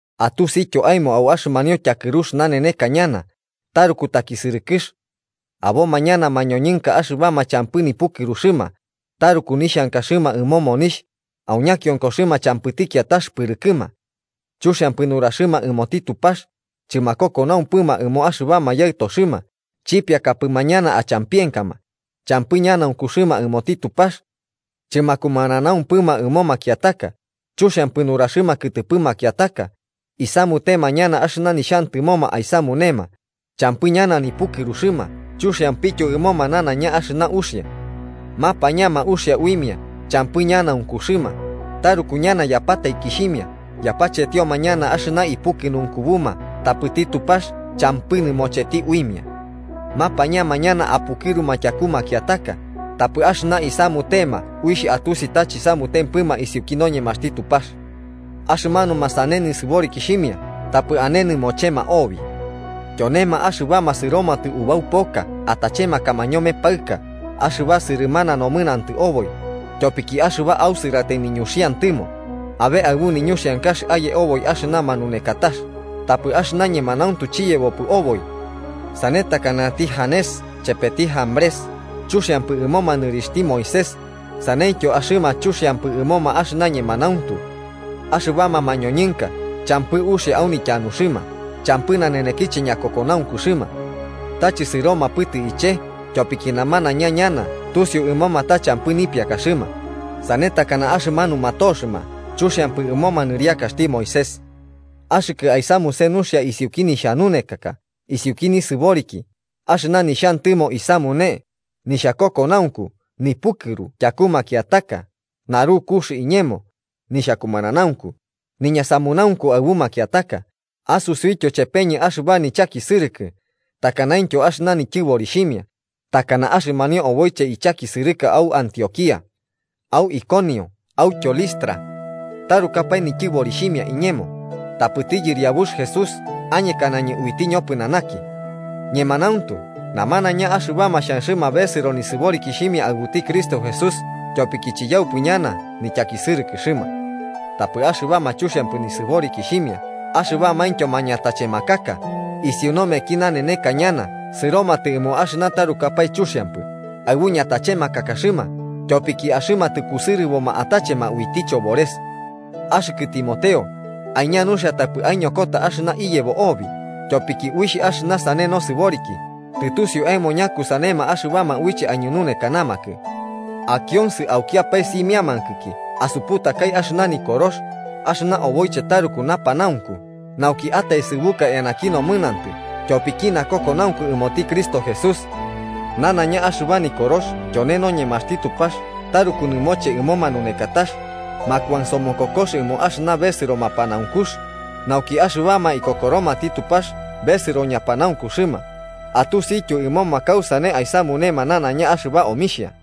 Atusityo aemo au axɨmanio tyakɨrux naneneka ñana taruku takisɨrɨkɨx. Aboma ñana mañoñɨnka axɨbama champɨ nipukɨruxɨma, taruku nixhankaxɨma ɨmo monixh, au ñakionkoxɨma champɨti kiatax pɨrɨkɨma. Chuxiampɨ nuraxɨma ɨmoti Tupax, chɨmakokonaumpɨma ɨmo axɨbama yaɨtoxɨma, chipiakapɨma ñana achampienkama, champɨ ñanaunkuxɨma ɨmoti Tupax. Chɨmakumananaumpɨma ɨmo makiataka, chuxiampɨ nuraxɨma kɨtɨpɨ makiataka, isamutema ñana axɨna nixhantɨmoma aisamunema, champɨ ñana nipukɨruxɨma chuxiampityo ɨmoma nanaiña axɨna uxia. Mapañama uxia uimia champɨ ñanaunkuxɨma, taruku ñana yapataikixhimia, yapachetioma ñana axɨna ipukɨnunkubuma tapɨti Tupax champɨ nɨmocheti uimia. Mapañama ñana apukɨruma tyaku makiataka, tapɨ axɨna isamutema uixh atusi ta chisamutempɨma isiuki noñemaxti Tupax. Axɨmanuma sane nisɨborikixhimia tapɨ ane nɨmochema obi. Tyonema axɨbama sɨromatɨ ubau poka atachemakama ñome paɨka axɨba sɨrɨmana nomɨnantɨ oboi, tyopiki axɨba ausɨratai niñuxantɨmo, abe aɨbu niñuxiankax aye oboi axɨna manunekatax, tapɨ axɨna ñemanauntu chiyebopɨ oboi. Sane takanati Janes chepeti Jambrés chuxiampɨ ɨmoma nɨriakaxti Moisés, saneityo axɨma chuxiampɨ ɨmoma axɨna ñemanauntu. Axɨbama mañoñɨnka champɨ uxia au nityanuxɨma, champɨ nanenekiche ñakokokoxɨma. Ta chɨsɨromapɨtɨ iche, tyopiki namanaiña ñana tusiu ɨmoma ta champɨ nipiakaxɨma, sane takana axɨmanuma toxɨma chuxiampɨ ɨmoma nɨriakaxti Moisés. Axɨkɨ aisamuse nuxia isiuki nixhanunekaka, isiuki nisɨboriki, axɨna nixhantɨmo isamune, nixhakokonaunku, nipukɨru tyaku makiataka, narukux iñemo, nixhakumananaunku, niñasamunaunku aɨbu makiataka, asutiutyo chepeñɨ axɨba nichakisɨrɨkɨ takanaintyo axɨna nityɨborixhimia, takana axɨmanio oboiche ichakisɨrɨka au Antioquía, au Iconio autyo Listra. ¡Tarukapae nityɨborixhimia iñemo! Tapɨti Yɨriabux Jesús añekanañɨ uiti ñopɨnanaki. Ñemanauntu, namanaiña axɨbama xhanxɨma besɨro nisɨborikixhimia aɨbuti Cristo Jesús tyopiki chiyaupɨ ñana nityakisɨrɨkɨxɨma. Tapɨ axɨbama chuxhiampɨ nisɨborikixhimia axɨbamaintyo mañatachemakaka isiu nomeki naneneka ñana sɨromatɨ ɨmo axɨna tarukapae chuxiampɨ, aɨbu ñatachemakakaxɨma, tyopiki axɨma tɨkusɨrɨboma atachema uiti chobores. Axɨkɨ Timoteo, aiña nuxia tapɨ aiñokota axɨna iyebo obi, tyopiki uixh axɨna sane nasɨboriki, tɨtusiu aemo ñakusanema axɨbama uiche aiñununekanamakɨ. Akionsɨ aukiapae simiankɨki asuputakai axɨna Nikorox, axɨba oboiche taruku napanaunku nauki ataesɨbuka eanaki nomɨnantɨ tyopiki nakokonaunku ɨmoti Cristo Jesús. Nanaiña axɨba Nikorox tyone noñemaxti Tupax taruku nɨmoche ɨmo manunekatax, makuansomokokox, ɨmo axɨna besɨro mapanaunkux, nauki axɨbama ikokoromati Tupax besɨro ñapanaunkuxɨma, atusityo ɨmoma kausane aisamunema nanaiña axɨba omixhia.